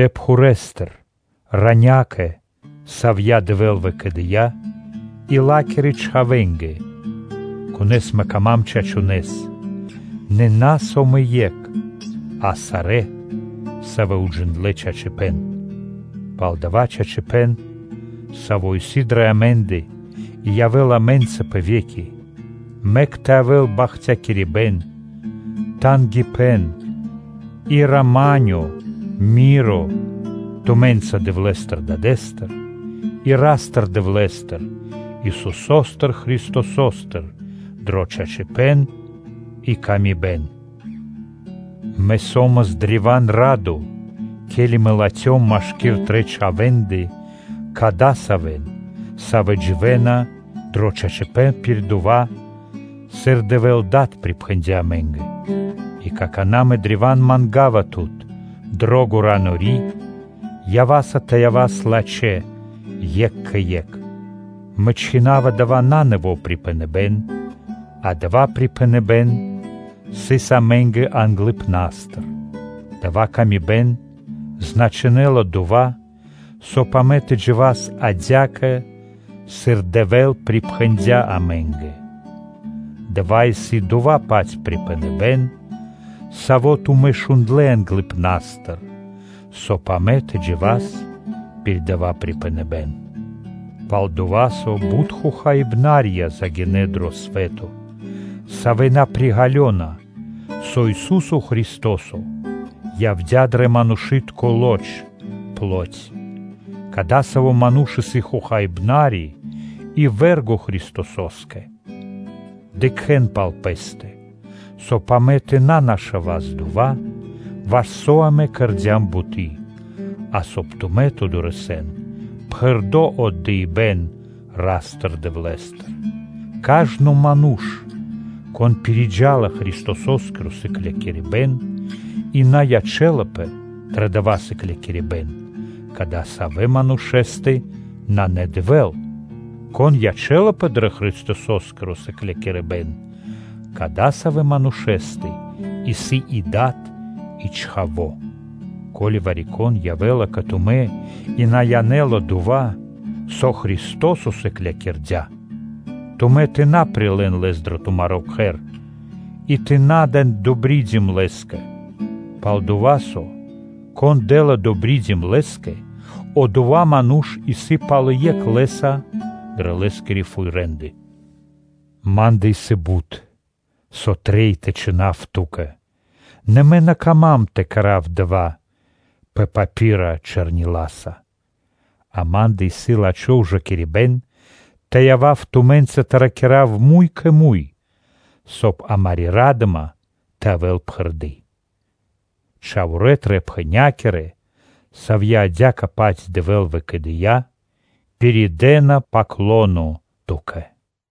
Пхурэстыр, – Ранякэ, Савья Дэвэ́л выкэдыя́, и Ла́кирэ чхавэ́нгэ, савэ́ исын дро́га ма́нгэ чачунэ́с, нэ на со мэ екх, а сарэ́, савэ́ уджиндлэ́ чачипэ́н, пал дава́ чачипэ́н, саво́ исын дрэ амэ́ндэ и явэ́ла амэ́нца пэ ве́ки: мэк тэ явэ́л бахтякирибэ́н, тангипэ́н, и рама́нё тумэ́нца Дэвлэ́стыр Дадэ́стыр и Ра́стыр-Дэвлэ́стыр, Исусо́стыр Христосостыр дро чачипэ́н и ла́ска. Мэ со́мас древа́н радо, ке́ли Мэ латхём машки́р Тырэ́ чхавэ́ндэ кадасавэн, савэ́ дживэ́на дро чачипэ́н пир дава́, сыр Дэвэ́л Дад припхэндя́ амэ́нгэ. И какана́ Мэ древа́н манга́ва Тут, дро́го Ранори; ява́са тэ явас лачхэ́ екх кэ екх. Мэ чхина́ва дава́ на нэво́ припхэныбэ́н, а дава́ припхэныбэ́н сыс амэ́нгэ англыпна́стыр. Дая́ пшалы́тко паты́в значинэла дова́, соб (кай) амэ тэ джива́с адя́кэ, сыр Дэвэ́л припхэндя́ амэ́нгэ. Дава́ исын дова́-паць припхэныбэ́н, саво́ тумэ́ шундлэ́ англыпна́стыр, соб (кай) амэ тэ джива́с пир дава́ припхэныбэ́н. Пал-дова́ со бут хохаибнарья загинэ́ дро свэ́то, савэ́ на приґалёна, со Ису́со Христо́со явдя́ дро манушы́тко лоч. Кадасаво́ ману́ш исын хохаибнари и вэ́рго (врого) Христосо́скэ. Дыкхэ́н пал пэ́стэ, соб (кай) амэ тэ на нашавас дова́, ваш со амэ кэрдя́м буты́, а соб (кай) тумэ́ тэ дорэсэн пхэрды́ мазу́ри (награда) Ра́стыр-Дэвлэ́стыр. Кажно ману́ш, кон пириджала Христосо́скиро сыклякирибэ́н и на ячэ́лапэ дро дава́ сыклякирибэ́н, кадасавэ́ манушэ́стэ нанэ Дэвэ́л. Кон ячэ́лапэ дро Христосо́скиро сыклякирибэ́н, кадасавэ́ манушэ́стэ исын и Дад и Чхаво́. Ко́ли вари-кон явэ́ла кэ тумэ́ и на янэ́ла дова́, со Христо́со сыклякирдя́, тумэ́ тэ на прилэ́н лэс дро тумаро́ кхэр и тэ на дэн ‘добридим’ лэ́скэ. Пал-дова́ со, кон дэ́ла ‘добридим’ лэ́скэ, одова́ ману́ш исын пал екх лэ́са дрэ лэ́скирэ фуй рэ́нды. Ма́ндэ исын бут, со трэй тэ чхинав ту́кэ, нэ мэ на кама́м тэ кэра́в дава́, пэ папира чэрниласа. Амэ́ндэ исын наде́я тэ явав тумэ́нца тэ ракира́в муй кэ муй, соб (кай) амари́ ра́дыма тэ явэ́л пхэрды́. Чхаворэ́ тырэ́-пхэнякирэ, савья́ адя́кэ-паць Дэвэ́л выкэдыя́, пиридэна “паклоно” ту́кэ.